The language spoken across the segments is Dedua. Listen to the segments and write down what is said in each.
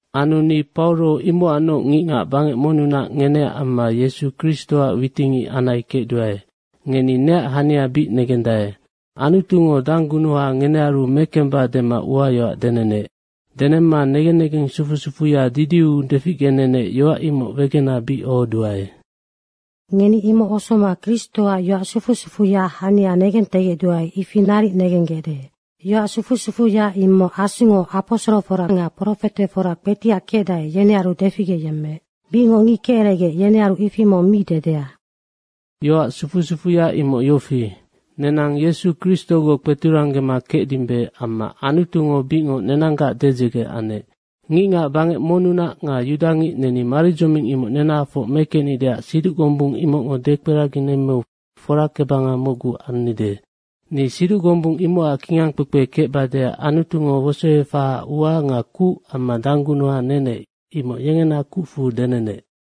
Anu ni Pauro imocacnoc ngicngac bangec monnunac ngeneac amma Yesu Kristoac witicngic anai kecduae. Ngeni neac hania bic negendae. Anutungo danggunuha ngenearu mekemba dema uayoac denenec. Denemma negen negeng sufu sufuya didiu deficgenenec, yoac imocnoc wegena bic ohoduae. Ngeni imoc osoma Kristoac yoac sufu sufuya hania negentegecduae, ifi naric negenggecde. Yoac sufu sufuya imoc Asungo aposorofora nga profetefora kpetiac kecdae, yenearu deficgeyemmeec. Bicngoc ngic keceregec, yenearu ifi mong mi dedea. Yoac sufu sufuya imoc yofi, nenang Yesu Kristogoc kpeturanggema kecdimbe amma Anutungo bicngoc nenanggac dedzege anec. Ngicngac bangec monnunac nga yudangic neni maridzoming imoc nenahafoc mekecnideac siduc gombung imocngo dekperaginemmeu forakebanga mocgu annide. Ni siduc gombung imocac kingangkpekpe kecbadeac Anutungo wosoefahaac ua nga kuc amma danggunuha nenec, imoc yengena kucfu denenec.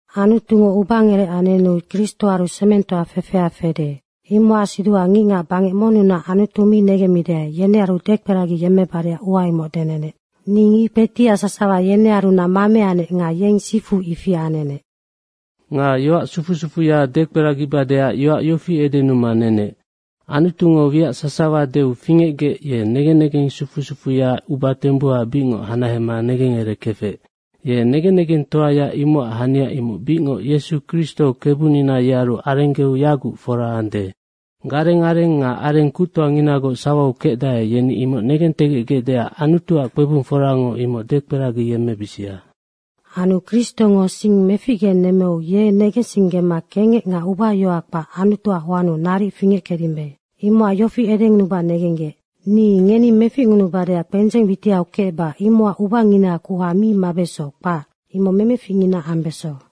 Anutungo ubangerec anenu Kristoaru semengtoa fefea fede, imocac siduha ngicngac bangec monnunac Anutu mi negemmidae, yenearu dekperagiyemmebadeac ua imoc denenec. Ni ngic kpetiac sasawa yenearunac mameanec nga yeng sifu ifi anenec. Nga yoac sufu sufuya dekperagibadeac yoac yofi edenuma nenec, Anutungo wiac sasawa deu fingecgec, ye negen negensufuya uba tembuha bicngoc hanahema negengerekefec. Ye negen negentegectoaya imocac hania imoc bicngoc Yesu Kristo Kebunina yearu arenggeu yaguc fora ande. Gareng areng nga areng kuctoanginagoc sawau kecdae, yeni imoc negentegecgecdeac Anutuac kpebungforango imoc dekperagiyemmebisia. Anu Kristongo sing meficgenemmeu ye negensinggema kengec nga ubayohoa kpac Anutuac hoannu naric fingeckecdimbe. Imocac yofi edengunuba negenggec: Ni ngeni meficngunubadeac kpendzeng witiau kecba imocac ubangina kuha mi mabeso, kpac. Imoc memeficngina ambeso.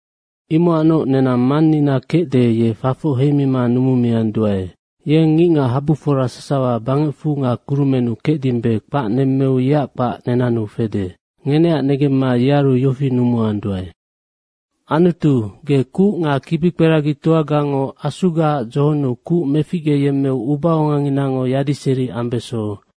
Imocacnoc nenang Mannina kecde, ye fafoc heimima numumianduae. Yeng ngicngachabufora sasawa bangecfu nga kurumennu kecdimbe kpac nemmeu yeac kpac nenannu fede. Ngeneac negemma yearu yofi numuanduae, “Anutu, ge kuc nga kibikperagitoagango Asugaac dzohonnu kuc meficgeyemmeu ubaonganginango yadiseri ambeso.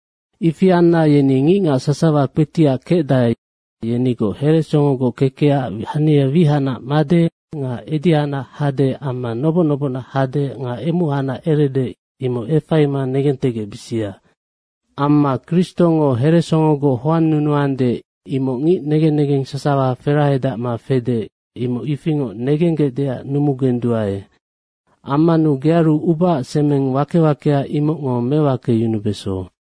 Ifi anna yeni ngicngac sasawa kpetiac kecdae, yenigoc heresongogoc kekecac hania wihacnac made nga edihacnac hade amma noboc nobocnac hade nga emuhacnac erede, imoc efaima negentegecbisia. Amma Kristongo heresongogoc hoannunuande, imoc ngic negen negeng sasawa ferahedacma fede, imoc ifingoc negenggecdeac numugenduae. Ammanu gearu ubaac semeng wake wakea, imocngo mewakeyunubeso.”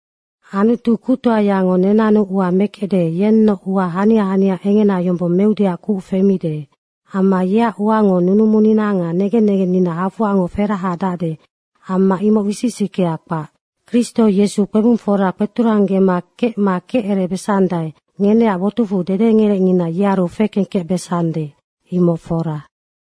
Anutu kuctoayango nenannu ua mekecde, yennoc ua hania hania engena yombong meudeac kuc femide. Amma yeac uango nunumunina nga negen negennina homac ferahedacde amma imoc wisic wisickea kpac. Kristo Yesu kpebungfora kpeturanggema kecma kecerebesandae, ngeneac botucfu dedengerecngina yearu fekengkecbesande. Imoc fora.